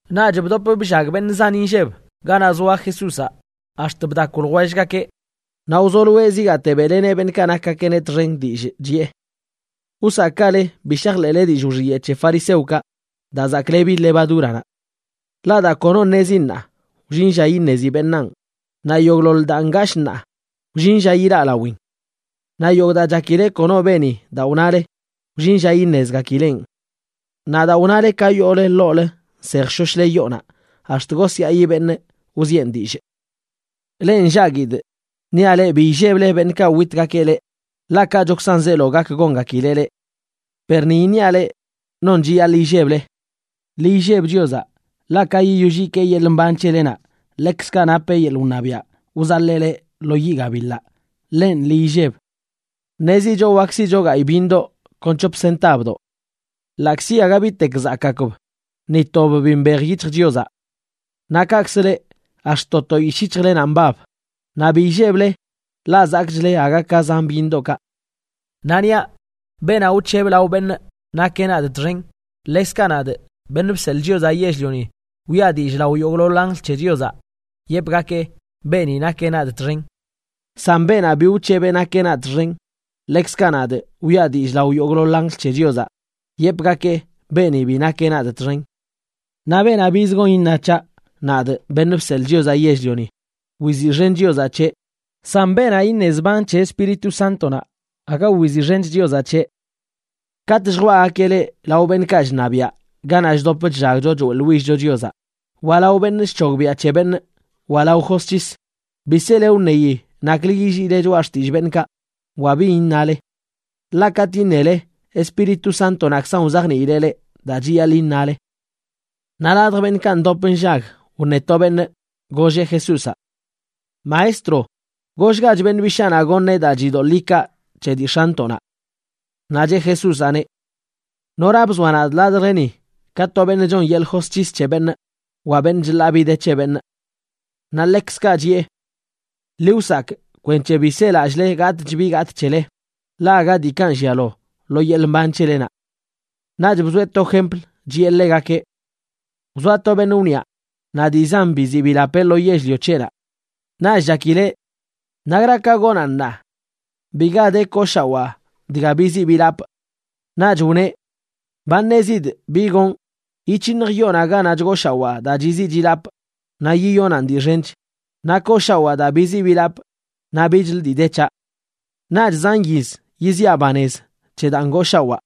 Naꞌch bdop bllag beṉꞌ zan inlleb ganaꞌ zoa Jesúzaꞌ ax̱t chdakw ljwellgakeꞌ, naꞌ wzoloeꞌ zigaate beꞌleneꞌ beṉꞌkaꞌ nakgakeꞌneꞌ txen dillꞌ, chiꞌe: ―Wsakꞌgale bi shajḻeꞌle dillꞌ wxiyeꞌ c̱he fariseokaꞌ daa zaklebi levadúranaꞌ. Ḻaꞌ daa kono ṉezi ṉaa, wllin lla iṉezi beṉaan, naꞌ yogꞌḻoḻ daa ngashꞌ ṉaa, wllin lla ilaꞌ lawin. Naꞌ yogꞌ daa chakile kono beni daa wnale, wllin lla iṉezgakileꞌn. Naꞌ daa wnale ka yoole ḻoolə nsejshoshle yoonaꞌ, ax̱t gosyaꞌi beṉꞌ wzieꞌn dillꞌ. ’Leꞌ nllaguidꞌ, niaꞌ leꞌ bi illeble beṉꞌkaꞌ witgakeꞌ leꞌ, ḻaꞌ kachokzan zeelo gak gongakileꞌ leꞌ. Per ni iṉiaꞌ leꞌ non chiyaḻꞌ illeble: ḻi illeb Chiozaꞌ, ḻaꞌ ka yiyoll yikee yeḻꞌ mban c̱helenaꞌ ḻekzkaꞌ napeꞌ yeḻꞌ wṉabiaꞌ wzaḻee leꞌ lo yiꞌ gabiḻaꞌ. Ḻenꞌ, ḻi illeb. ’Ṉezicho wak siꞌcho gayꞌ byiṉdoꞌ kon c̱hop sintabdoꞌ. Ḻaꞌkzi aga bitek zakꞌgakb, ni tob bi mbej yic̱hj Chiozaꞌ. Naꞌ kaꞌkzə leꞌ, ax̱t to to yishꞌ yic̱hjlenaꞌ mbab. Naꞌ bi illeble, ḻaꞌ zakꞌchle aga ka zan byiṉdoꞌkaꞌ. ’Naꞌ niaꞌ leꞌ, beenaꞌ wc̱heb lao beṉꞌ nakeꞌ nadꞌ txen, ḻekzkaꞌ nadꞌ, Beṉꞌ Bseḻꞌ Chiozaꞌ Yell-lioni, wiꞌa dillꞌ lao yogꞌḻoḻ anjl c̱he Chiozaꞌ, yepgakee beeni nakeꞌ nadꞌ txen. San beenaꞌ bi wc̱heb nakeꞌ nadꞌ txen, ḻekzkaꞌ nadꞌ, wiꞌa dillꞌ lao yogꞌḻoḻ anjl c̱he Chiozaꞌ, yepgakee beeni bi nakeꞌ nadꞌ txen. ’Naꞌ beenaꞌ biz gon iṉa c̱haꞌ, nadꞌ, Beṉꞌ Bseḻꞌ Chiozaꞌ Yell-lioni, wiziꞌxen Chiozaꞌ c̱heꞌ, san beenaꞌ iṉe zban c̱he Espíritu Sántonaꞌ, aga wiziꞌxen Chiozaꞌ c̱heꞌ. ’Katꞌ lljwaꞌgakeꞌ leꞌ lao beṉꞌkaꞌ chṉabiaꞌ ganaꞌ chdop chllagcho choeꞌḻwill-cho Chiozaꞌ, wa lao beṉꞌ chc̱hogbiaꞌ c̱he beṉꞌ wa lao josc̱his, bi sele wṉeyi naklə yilliile choꞌa xtillꞌ beṉꞌkaꞌ wa bin iṉale. Ḻaꞌ katꞌ iṉele, Espíritu Sántonaꞌkzan wzajniileꞌ leꞌ daa chiyaḻꞌ iṉale. Naꞌ ladj beṉꞌkaꞌ ndop nllag wṉe to beṉꞌ, golleꞌ Jesúzaꞌ: ―Maestro, gollgach beṉꞌ bishaanaꞌ goṉeꞌ daa chidoḻꞌ ikaa c̱he dii x̱antoꞌnaꞌ. Naꞌ cheꞌ Jesúzaꞌneꞌ: ―¿Nora bzoa nadꞌ ladjleni ka to beṉꞌ chon yeḻꞌ josc̱his c̱he beṉꞌ wa beṉꞌ chḻaa bi dii de c̱he beṉꞌ? Naꞌ ḻekzkaꞌ chiꞌe: ―Ḻi wsakꞌ kwenc̱he bi selallꞌle gatꞌch bi gatꞌ c̱hele, ḻaꞌ aga dii kanꞌ llialo lo yeḻꞌ mban c̱helenaꞌ. Naꞌch bzoeꞌ to jempl, chiꞌe ḻegakeꞌ: ―Wzoa to beṉꞌ wniꞌa naꞌ dii zan biziꞌ bilapeꞌ lo yell-lio c̱heꞌnaꞌ. Naꞌch chakileꞌ: “¿Nakra ka gonaꞌn ṉaa? Biga de kooshawaa dga biziꞌ bilapꞌ.” Naꞌch wneꞌ: “Ba ṉezidꞌ bi gonꞌ. Yic̱hiṉjꞌ yoonaꞌ ganaꞌ chgooshawaa daa chiziꞌ chilapꞌ naꞌ yiyonaꞌn dii xench, naꞌ kooshawaa daa biziꞌ bilapꞌ naꞌ bichlə dii de c̱haꞌ. Naꞌch zan yiz yiziaꞌ banez c̱he daa ngooshawaa,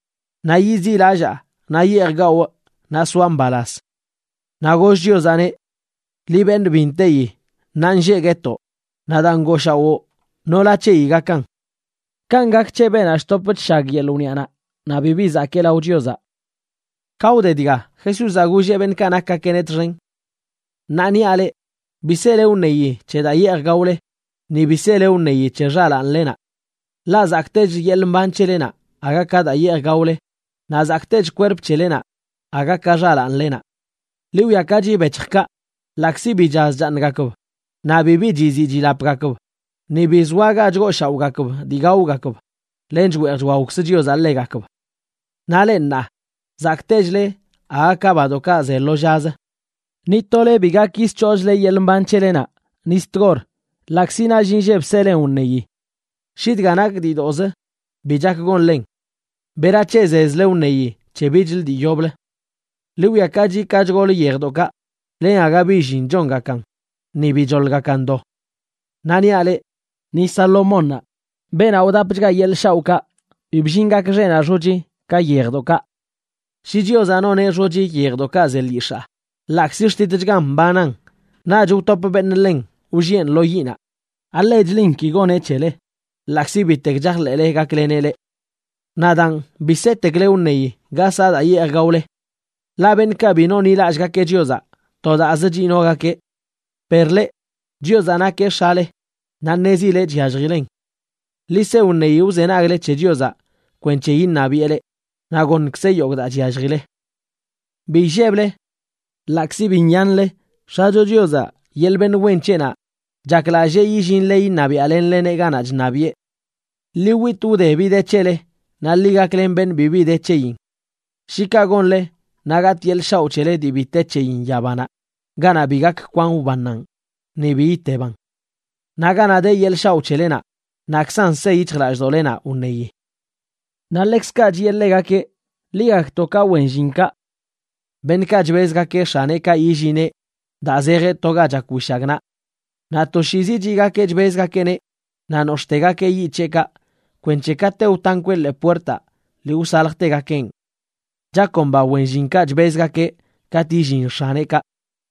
naꞌ yiziꞌlallaa naꞌ yeej gawꞌ, naꞌ soaꞌ mbalaz.” Naꞌ goll Chiozaꞌneꞌ: “Liꞌ, beṉꞌ bi nteyi, ṉaanlleꞌ guetoꞌ naꞌ daa ngooshawoo, nola c̱heyi gakan.” Kanꞌ gak c̱he beenaꞌ chtop chshag yeḻꞌ wniꞌanaꞌ, naꞌ bibi zakee lao Chiozaꞌ. Ka wde dga, Jesúzaꞌ golleꞌ beṉꞌkaꞌ nakgakeꞌneꞌ txen: ―Ṉaa niaꞌ leꞌ: Bi sele wṉeyi c̱he daa yeej gaole, ni bi sele wṉeyi c̱he xalaanlenaꞌ. Ḻaꞌ zakꞌtechlə yeḻꞌ mban c̱helenaꞌ aga ka daa yeej gaole, naꞌ zakꞌtech xkwerplenaꞌ aga ka xalaanlenaꞌ. Ḻi wwiakachi bec̱hjkaꞌ, ḻaꞌkzi bi chaz chaaṉgakb naꞌ bibi chiziꞌ chilapgakb, ni bi zoa ga chgooshaoꞌgakb dii gaogakb, len chweej chwaokz Chiozaꞌ ḻegakb. Naꞌ leꞌ, ṉaa, zakꞌtechle aga ka badoꞌkaꞌ ze lo llazə. Ni tole bi gak yisc̱hoochle yeḻꞌ mban c̱helenaꞌ ni zi tgor ḻaꞌkzi nall inlleb selen wṉeyi. Shi dga nak diidoꞌzə bi chak gonlen, ¿berac̱he zezle wṉeyi c̱he bichlə dii yoblə? ’Ḻi wwiakachi ka chgol yejdoꞌkaꞌ, len aga bi llin chongakan ni bi choḻgakan do. Naꞌ niaꞌ leꞌ, ni Salomónnaꞌ, beenaꞌ wdapchga yeḻꞌ shaoꞌkaꞌ, bi bllin gak xeꞌnaꞌ xochi ka yejdoꞌkaꞌ. Shi Chiozaꞌ noneꞌ xochi yejdoꞌkaꞌ ze lyix̱aa, ḻaꞌkzi xtitchgan mbanan naꞌch wtop beṉꞌ ḻen wlliꞌen lo yiꞌnaꞌ, ¿alechlin ki goneꞌ c̱hele, ḻaꞌkzi bitek chajḻeꞌle gakleneꞌ leꞌ? Naꞌ daan bi setekle wṉeyi ga saꞌ daa yeej gaole. Ḻaꞌ beṉꞌkaꞌ bi nonḻilallꞌgakeꞌ Chiozaꞌ to daazə chinogakeꞌ. Per leꞌ, Chiozaꞌ nakeꞌ X̱ale, naꞌ ṉezileꞌ chyalljilen. Ḻi se wṉeyi wzenagle c̱he Chiozaꞌ kwenc̱he iṉabiꞌe leꞌ, naꞌ goṉkzeꞌ yogꞌ daa chyalljile. ’Bi illeble. Ḻaꞌkzi bi nyanle, X̱acho Chiozaꞌ, yeḻꞌ beṉꞌ wen c̱heꞌnaꞌ, chaklallee yillinle iṉabiaꞌlenleneꞌ ganaꞌ chṉabiꞌe. Ḻi witꞌ wde bi de c̱hele, naꞌ ḻi gaklen beṉꞌ bibi de c̱heyin. Shi kaꞌ gonle, naꞌ gatꞌ yeḻꞌ shaoꞌ c̱hele dii bi te c̱heyin yabanaꞌ ganaꞌ bi gak kwan wbannaꞌn, ni bi iteban. Naꞌ ganaꞌ de yeḻꞌ shaoꞌ c̱helenaꞌ, naꞌkzan se yic̱hjlallꞌdoꞌlenaꞌ wṉeyi. Naꞌ ḻekzkaꞌ chiꞌe ḻegakeꞌ: ―Ḻi gakto ka wen llinkaꞌ, beṉꞌkaꞌ chbezgakeꞌ x̱aneꞌkaꞌ yillineꞌ daa zejeꞌ to ga chak wishagnaꞌ. Naꞌ toshiizi chiꞌgakeꞌ chbezgakeꞌneꞌ naꞌ nox̱ꞌtegakeꞌ yiꞌ c̱heꞌkaꞌ kwenc̱he kate wtankweꞌ ḻee puertaꞌ lii wsaljtegakeꞌn. Chakomba wen llinkaꞌ chbezgakeꞌ katꞌ yillin x̱aneꞌkaꞌ,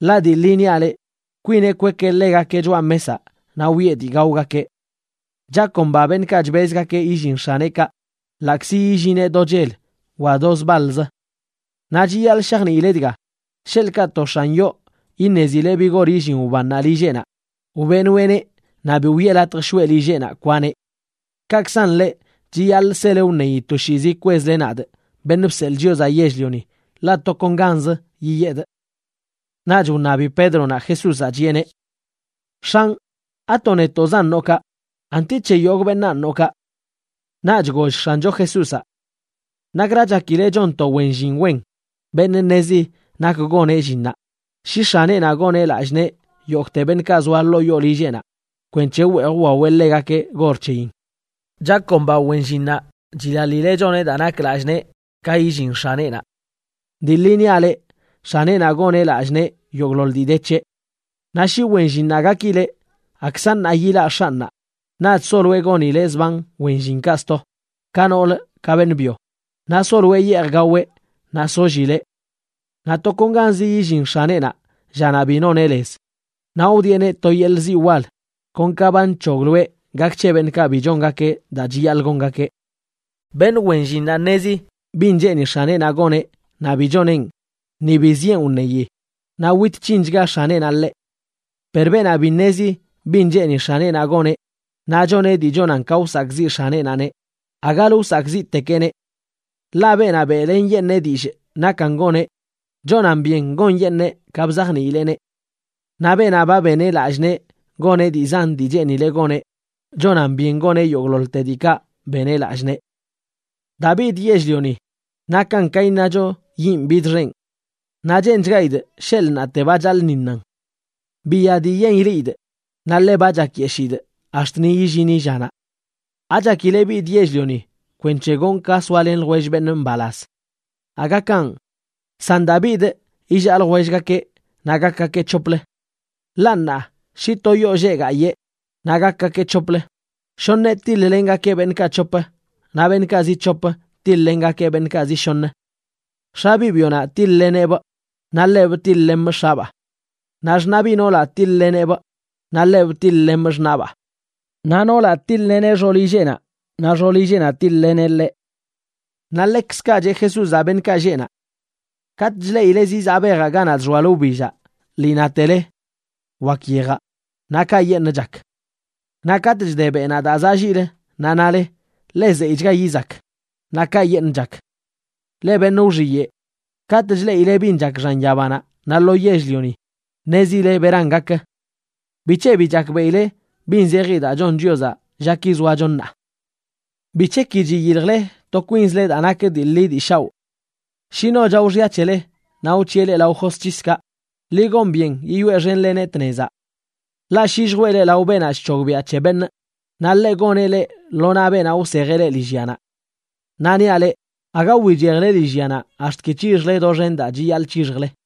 ḻaꞌ dii ḻi niaꞌ leꞌ, kwineꞌ kwekeꞌ ḻegakeꞌ choꞌa mesaꞌ naꞌ wiꞌe dii gaogakeꞌ. Chakomba beṉꞌkaꞌ chbezgakeꞌ yillin x̱aneꞌkaꞌ ḻaꞌkzi yillineꞌ do chel wa do zbaḻzə. Naꞌ chiyaḻꞌ shajniile dga, sheḻꞌkaꞌ to x̱an yoo iṉezileꞌ bi gor illin wbannaꞌ lilleꞌnaꞌ, wbeꞌnoeꞌneꞌ naꞌ bi wiꞌe latj shoꞌe lilleꞌnaꞌ kwaneꞌ. Kaꞌkzan leꞌ chiyaḻꞌ sele wṉeyi toshiizi kwezle nadꞌ, Beṉꞌ Bseḻꞌ Chiozaꞌ Yell-lioni, ḻaꞌ tokonganzə yiyedꞌ. Naꞌch wṉabi Pédronaꞌ Jesúzaꞌ, chiꞌeneꞌ: ―X̱anꞌ, ¿ato netoꞌzan noꞌ kaꞌ, anti c̱he yogꞌ beṉaan noꞌ kaꞌ? Naꞌch goll X̱ancho Jesúzaꞌ: ―¿Nakra chakile chon to wen llin wen, beṉꞌ ṉezi nak goneꞌ llinnaꞌ, shi x̱aneꞌnaꞌ goneꞌ lallꞌ nee yogꞌte beṉꞌkaꞌ zoa ḻoo yoo lilleꞌnaꞌ kwenc̱he wweej wwaweꞌ ḻegakeꞌ gor c̱heyin? Chakomba wen llinnaꞌ chilaḻileꞌ choneꞌ daa nak lallꞌ nee ka yillin x̱aneꞌnaꞌ. Dii ḻi niaꞌ leꞌ, x̱aneꞌnaꞌ goneꞌ lallꞌ nee yogꞌḻoḻ dii de c̱heꞌ. Naꞌ shi wen llinnaꞌ gakileꞌ: “Akza ṉaa yilaꞌ x̱anꞌnaꞌ”, naꞌch soloeꞌ gonileꞌ zban wen llinkaꞌ sto, ka nool ka beṉꞌ byo, naꞌ soloeꞌ yeej gaweꞌ naꞌ sollileꞌ. Naꞌ tokonganzi yillin x̱aneꞌnaꞌ llanaꞌ bi noneꞌ lez, naꞌ wdieꞌneꞌ to yeḻꞌ ziꞌ wal kon ka ba nc̱hogloeꞌ gak c̱he beṉꞌkaꞌ bi chongakeꞌ daa chiyaḻꞌ gongakeꞌ. ’Beṉꞌ wen llinnaꞌ ṉezi bin cheeni x̱aneꞌnaꞌ goneꞌ, naꞌ bi choneꞌn ni bi zieꞌn wṉeyi, naꞌ wit c̱hinchga x̱aneꞌnaꞌ ḻeꞌ. Per beenaꞌ bi ṉezi bin cheeni x̱aneꞌnaꞌ goneꞌ, naꞌ choneꞌ dii chonan ka wsakꞌziꞌ x̱aneꞌnaꞌneꞌ, agalə wsakꞌziꞌtekeꞌneꞌ. Ḻaꞌ beenaꞌ beꞌlenyeṉee dillꞌ nakan goneꞌ, chonan byen gonyeṉee ka bzajniileꞌneꞌ. Naꞌ beenaꞌ ba beneꞌ lallꞌ nee goneꞌ dii zan dii cheenileꞌ goneꞌ, chonan byen goneꞌ yogꞌḻoḻte diikaꞌ beneꞌ lallꞌ nee. ’Daa bidꞌ yell-lioni nakan ka iṉacho yinꞌ bidxenꞌ. Naꞌ cheenchgaidꞌ sheḻꞌ ṉaate ba chaḻꞌṉiṉan. Biya dii yen ileꞌidꞌ, naꞌ ḻe ba chakyeshidꞌ ax̱t ni illini llanaꞌ. ¿Achakile bidꞌ yell-lioni kwenc̱he gonꞌ ka soalen ljwell beṉꞌ mbalaz? Aga kanꞌ, san daa bidꞌ illaa ljwellgakeꞌ naꞌ gakgakeꞌ c̱hoplə. Ḻaꞌ ṉaa, shi to yoo lleꞌ gayee, naꞌ gakgakeꞌ c̱hoplə, shoṉeꞌ tiḻ-lengakeꞌ beṉꞌkaꞌ c̱hop, naꞌ beṉꞌkaꞌ zi c̱hop tiḻ-lengakeꞌ beṉꞌkaꞌ zi shoṉə. X̱a biꞌ byonaꞌ tiḻ-leneꞌbꞌ, naꞌ ḻebꞌ tiḻ-lemꞌ x̱abaa. Naꞌ xṉaꞌ biꞌ noolaꞌ tiḻꞌleneꞌbꞌ, naꞌ ḻebꞌ tiḻ-lemꞌ xṉaꞌbaa. Naꞌ noolaꞌ tiḻ-leneꞌ xoolilleꞌnaꞌ, naꞌ xoolilleꞌnaꞌ tiḻ-leneꞌ ḻeꞌ. Naꞌ ḻekzkaꞌ cheꞌ Jesúzaꞌ beṉꞌkaꞌ lleꞌ naꞌ: ―Katꞌ chleꞌile zizaꞌ bejaꞌ ganaꞌ chxoalə wbillaꞌ, lii natele: “Wakə yejaꞌ”, naꞌ kayeṉꞌ chak. Naꞌ katꞌ chde beꞌnaꞌ daa zaꞌ lliꞌlə, naꞌ nale: “Ḻe zeyꞌchga yizak”, naꞌ kayeṉꞌ chak. ¡Leꞌ beṉꞌ wxiyeꞌ! Katꞌ chleꞌile bin chak xan yabanaꞌ naꞌ lo yell-lioni ṉezile beran gak. ¿Bic̱he bi chakbeꞌile bin zeji daa chon Chiozaꞌ llaki zoacho ṉaa? ’¿Bic̱he ki chiyiljle to kwinzle daa nak dii ḻi dii shaoꞌ? Shi no chao xya c̱hele naꞌ wc̱hiꞌe leꞌ lao josc̱hiskaꞌ, ḻi gon byen yiyoeꞌxenleneꞌ tnezaꞌ. Ḻaꞌ shi lljwee leꞌ lao beenaꞌ chc̱hogbiaꞌ c̱he beṉꞌ, naꞌ ḻeꞌ goneꞌ leꞌ lo naꞌ beenaꞌ wsejeꞌ leꞌ lillyanaꞌ. Naꞌ niaꞌ leꞌ, aga wichejle lillyanaꞌ ax̱t ki c̱hixjle doxen daa chiyaḻꞌ c̱hixjle.